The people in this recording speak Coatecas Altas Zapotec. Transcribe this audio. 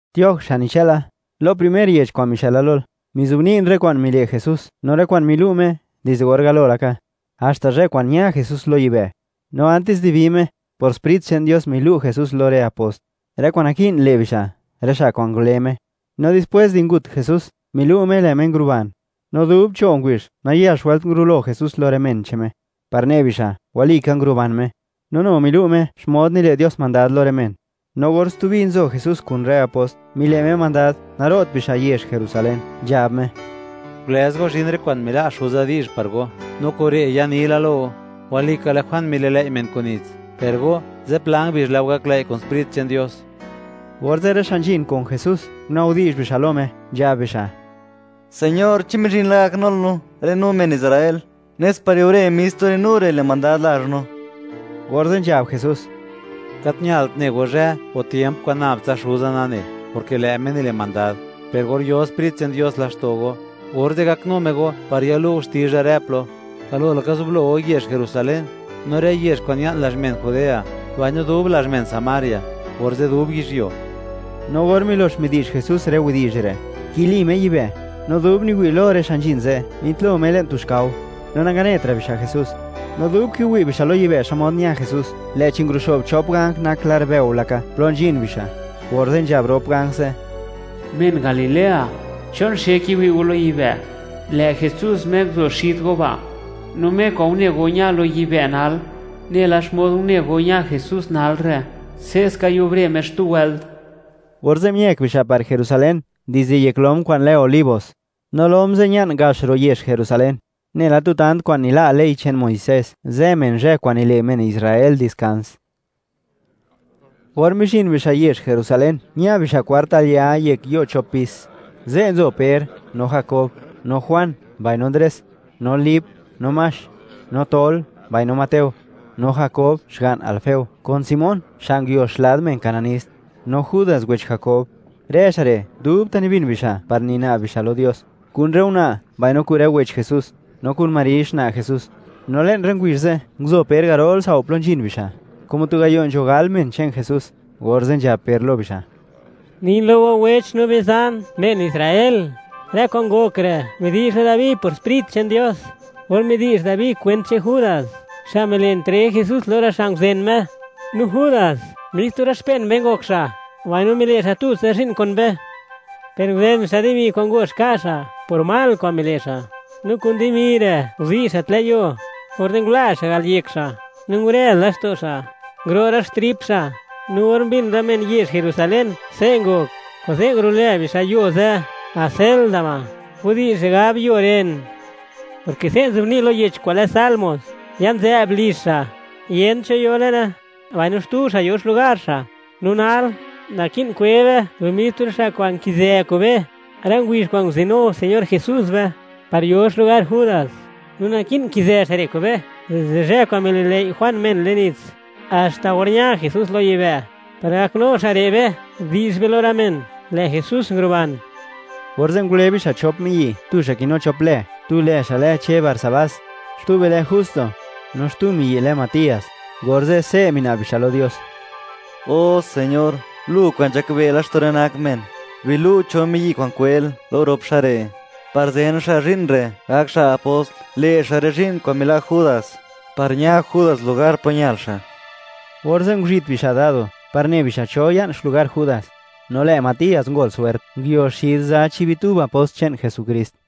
Tioj, xa' nichëla, lo primer yech kwa'n mixëla lol, mizobni'n rë kwa'n mile' Jesús, no rë kwa'n milu' Me, dizde or galo laka, haxta zhë kwa'n ña Jesús lo yibë'. No antis di bi Me, por Sprit che'n Dios milu' Jesús lo rë apost, rë kwa'n naki'n le' bixa', rë xa' kwa'n ngule Me. No dispwés di ngut Jesús, milu' Me lë' Me nguruban. No dub cho' ngubizh, nayax wëlt ngurulo Jesús lo rë men che'n Me, par ne bixa', walika, nguruban Me. No nu milu' Me xmod nile' Dios mandad lo rë men. No or stubi nzo Jesús kun rë apost, mile' Me mandad, naro't bixa' yezh Jerusalén, nzhab Me: ―Gulëz go, zhin rë kwa'n mila' Xuza di'zh par go, no kure' yanila lo go. Walika, lë' Juan mililëi' men kun nits, per go, zipla ngubizh lë' go gaklëi' kun Sprit che'n Dios. Orze', rë xa' nzhin kun Jesús, guna'bdi'zh bixa' lo Me, nzhab bixa': ―Señor, ¿chi mizhin la gaknul no, rë no men Israel, nes par yubre mis tu rë no re' le' mandad lazh no? Orze' nzhab Jesús: ―Gat ñalt ne go zhë o tiemp kwa'n nab tsa Xuza nane, porke lë' Me nile' mandad. Per or yo Sprit che'n Dios laxto' go, orze' gaknu Me go par yalu' go xtizha rë plo. Galo laka, zublou yezh Jerusalén, no rë yezh kwa'n ña'n lazh men Judea, mbaino dub lazh men Samaria, orze' dub yizhyuo. No or milox midi'zh Jesús rë widi'zh re', nkili Me yibë'; no dub niwi' lo rë xa' nzhin ze', mitlo Me le'n tu xkao, no nanganetra' bixa' Jesús. No dub kiwi' bixa' lo yibë' xmod ña Jesús, lë'chi nguruxo'b chop ganj nak lar bëo laka, plo nzhin bixa', orze' nzhab rop ganj ze': ―Men Galilea, ¿chon xe kiwi' go lo yibë'? Lë' Jesús Me nguzo xid go ba', no Me kwa'n une go ña lo yibë' nal, nela xmod une go ña Jesús nal re', se'ska yubre Me xtu wëlt. Orze' miëk bixa' par Jerusalén dizde yek lom kwa'n lë Olivos, no lom ze' ña'n gax ro' yezh Jerusalén, nela tu tant kwa'n nila' ley che'n Muisés, zë men zhë kwa'n nile' men Israel diskans. Or mizhin bixa' yezh Jerusalén, ña bixa' kwart al ya yek yo' chop pis. Ze' nzo Per, no Jakob, no Juan, mbaino Ndres, no Lip, no Max, no Tol, mbaino Mateo, no Jakob xga'n Alfeo, kun Simón xa' nguio xlad men cananist, no Judas wech Jakob. Rë xa' re', dubta' nibin bixa' par nina'b bixa' lo Dios, kun rë una', mbaino kun rë wech Jesús, no kun Mari xna' Jesús. No le'n rë ngubizh ze', nguzo Per garol tsao' plo nzhin bixa', como tu gayo' nzho gal men che'n Jesús, orze' nzhab Per lo bixa': ―Nin lo go wech no bizan, men Israel; rë kwa'n ngok re', midi'zh la Dabi por Sprit che'n Dios, or midi'zh Dabi kwent che'n Judas, xa' mile' entreg Jesús lo rë xa' nguzen Me. No Judas, mis tu rë xpen be ngok xa', mbaino mile' xa' tutsa zhi'n kun be, per nguzen xa' dimi kwa'n ngox ka' xa' por mal kwa'n mile' xa', no kun dimi re' nguzi' xa' tlë' yuo, orze' ngula xa' al yek xa', no ngurez laxto' xa', nguro' rë xtrip xa'. No or mbin rë men yezh Jerusalén, se' ngok, kuze' ngulo'lë bixa' yo ze' Acéldama, widi'zh re' gab, yo ren, porke se' nzobni' lo yech kwa'n lë Salmos: Ya'n nzë'b lizh xa'; yent cho yo le'ne, mbaino: Xtu xa' yo xlugar xa'. ’No nal, naki'n kwe be lo mis tu rë xa' kwa'n nkizë kun be, rë ngubizh kwa'n nguzinu Señor Jesús be, par yo xlugar Judas. No naki'n nkizë xa' re' kun be dizde zhë kwa'n mililëi' Juan men le'n nits, haxta or ña Jesús lo yibë'; par gaknu xa' re' be, di'zh be lo rë men, lë' Jesús nguruban. Orze' ngule bixa' chop miyi', tu xa' kinu chop lë; tu lë xa' lë Che Barsabás, xtube lë Justo. No xtu miyi' lë Matías. Orze', se' mina'b bixa' lo Dios: ―O Señor, Lu kwa'n nzhakbe' laxto' rë nak men; bilu' cho miyi' kwa'n kwel, lo rop xa' re', par zen xa' zhi'n re', gak xa' apost, le' xa' rë zhi'n kwa'n mila' Judas, par ña Judas lugar plo ñal xa'. Orze' nguzhit bixa' dado, par ne bixa' cho ya'n xlugar Judas. No lë' Matías ngol swert, nguio xid za chi' bitub apost che'n Jesukrist.